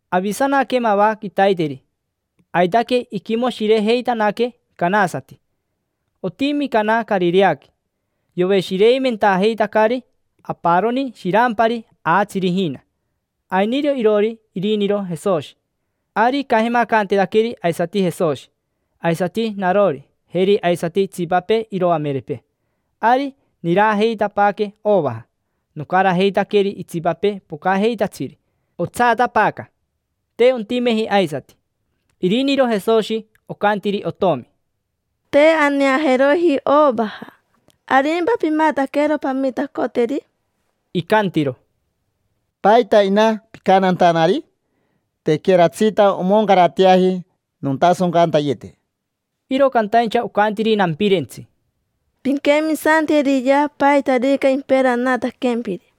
Avisanaque mava quitaiteri, aitaque iquimoshirejeitanaque canasati. Otimi Cana Carireaqui. Yoveshireimentajeitacari aparoni shirampari aatsiri ijina. Ainiro iroori iriniro Jesoshi. Ari icajemacanteetaqueri aisati Jesoshi, aisati narori, jeri aisati itsipapee iroamerepee. Ari nirajeitapaaque ovaja; nocarajeitaqueri itsipapee pocajeitatsiri. Otsaatapaaca, te ontimeji aisati. Iriniro Jesoshi ocantiri otomi: —Te aneajeroji ovaja: ¿arimpa pimataquero pamitacoteri? Icantiro: —¿Paita, ina, picantantanari? Tequeratsita omoncarateaji nontasoncantayete. Iro cantaincha ocantiri nampirentsi: —Pinquemisanteriyea paitarica imperanataquempiri.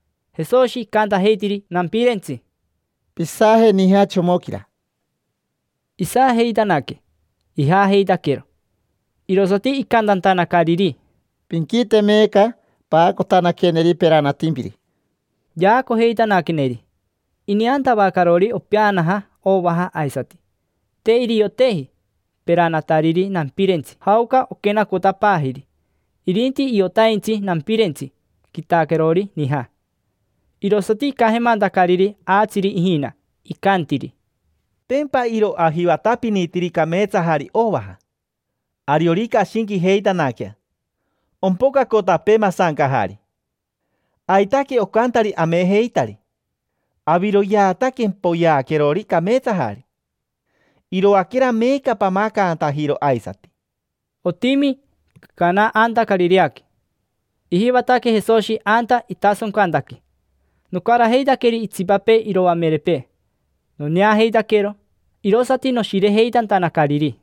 Jesoshi icantajeitiri nampirentsi: —Pisaje nija chomoquira. Isajeitanaque, ijaajeitaquero. Irosati icantantanacariri: —Pinquite meeca. Paacotanaqueneri peranatimpiri. Yaacojeitanaqueneri. Ineantavacarori, opeanaja ovaja aisati. Te irioteji peranatariri nampirentsi jaoca oquenacotapaajiri. Irinti iotaintsi nampirentsi quitaquerori nija. Irosati icajemantacariri aatsiri ijina. Icantiri: —Tempa iro ajivatapinitiri cameetsajari ovaja. Ariorica ashinquijeitanaquea ompocacotapee masancajari. Aitaque ocantari amejeitari. Aviroyeata quempoyeaquerori cameetsajari. Iroaquera meeca pamacantajiro aisati. Otimi Cana anta Carireaqui. Ijivataque Jesoshi anta itasoncantaque. Nocarajeitaqueri itsipapee iroamerepee noneajeitaquero, irosati noshirejeitantanacariri.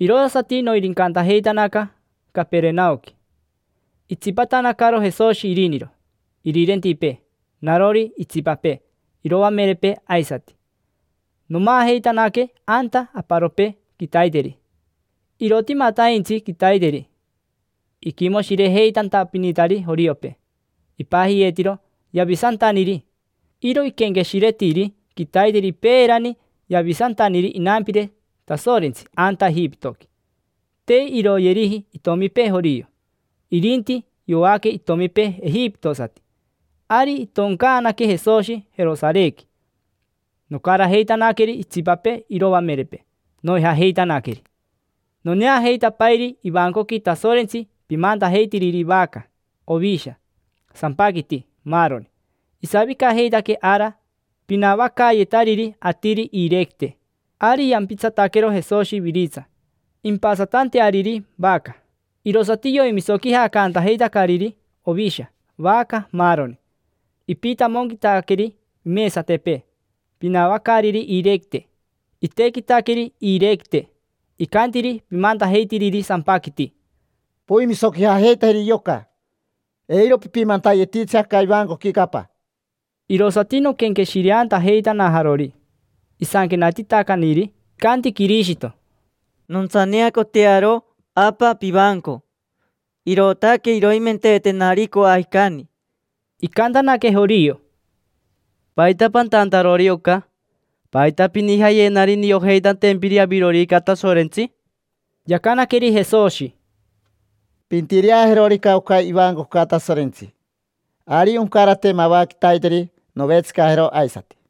Irosati noirincantajeitanaca Caperenaoqui. Itsipatanacaro Jesoshi iriniro, irirentipee, narori, itsipapee iroamerepee aisati. Nomaajeitanaque anta aparopee quitaiteri. Irotimataintsi quitaiteri iquimoshirejeitantapinitari joriopee, ipajiyeetiro: yavisantaniri. Iro iquenqueshiretiri quitaiteri peerani yavisantaniri inampire Tasorentsi anta Ejipitoqui: te iroyeriji itomipee jorio, irinti yoaque itomipee ejipitosati. Ari itoncaanaque Jesoshi Jerosarequi. Nocarajeitanaqueri itsipapee iroamerepee, noijajeitanaqueri. Noneajeitapairi ivancoqui Tasorentsi pimantajeitiriri vaca, ovisha, sampaquiti, maaroni. Isavicajeitaque ara pinavacaayetariri atiri iirequite. Ari yampitsataquero Jesoshi iviritsa impasatanteariri vaca. Irosati yoimisoquijacantajeitacariri ovisha, vaca, maaroni. Ipitamonquitaqueri imesatepee pinavacaariri iirequite, itequitaqueri iirequite. Icantiri pimantajeitiriri sampaquiti: —Poimisoquijajeitajeri yoca. Eiro pipimantayetitsi aca ivancoquica Apa. Irosati noquenqueshireantajeitanajarori isanquenatitacaniri: “Icanti Quirishito: ‘Nontsaneacotearo, Apa, pivanco; irootaque iroimenteetenari coajicani’”. Icantanaque jorio: —¿Paita pantantarori oca? ¿Paita pinijayenari niojeitantempiri avirorica Tasorentsi? Yacanaqueri Jesoshi: —Pintireajerorica oca ivancoca Tasorentsi, ari oncarate mava quitaiteri novetsicajero aisati.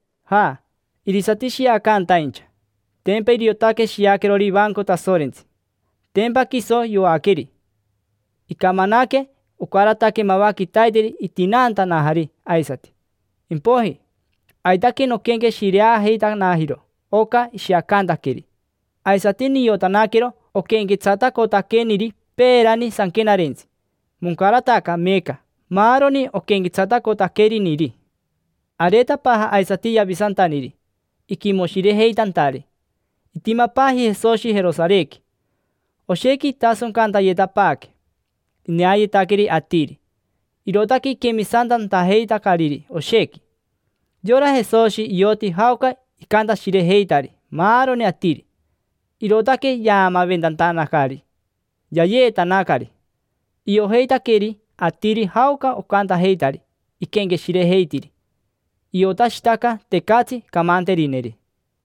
Ja, irisati shiacantaincha. Tempa iriotaque shiaquerori ivanco Tasorentsi, tempa quiso yoaqueri. Icamanaque, ocarataque mava quitaiteri itinaantanajari aisati. Impoiji, aitaque noquenqueshireajeitanajiro oca ishiacantaqueri. Aisati niotanaquero oquenquetsatacotaqueniri peerani sanquenarentsi, moncarataca meeca maaroni oquenquetsatacotaqueriniri. Areetapaaja aisati yavisantaniri, iquimoshirejeitantari. Itimapaaji Jesoshi Jerosarequi, oshequi itasoncantayetapaaque. Ineayetaqueri atiri, irootaque iquemisantantajeitacariri oshequi. Yora Jesoshi ioti jaoca icantashirejeitari maaroni atiri, irootaque yaamaventantanacari: “Yayeetanacari”. Iojeitaqueri atiri jaoca ocantajeitari iquenqueshirejeitiri. Iotashitaca, tecatsi camanterineri.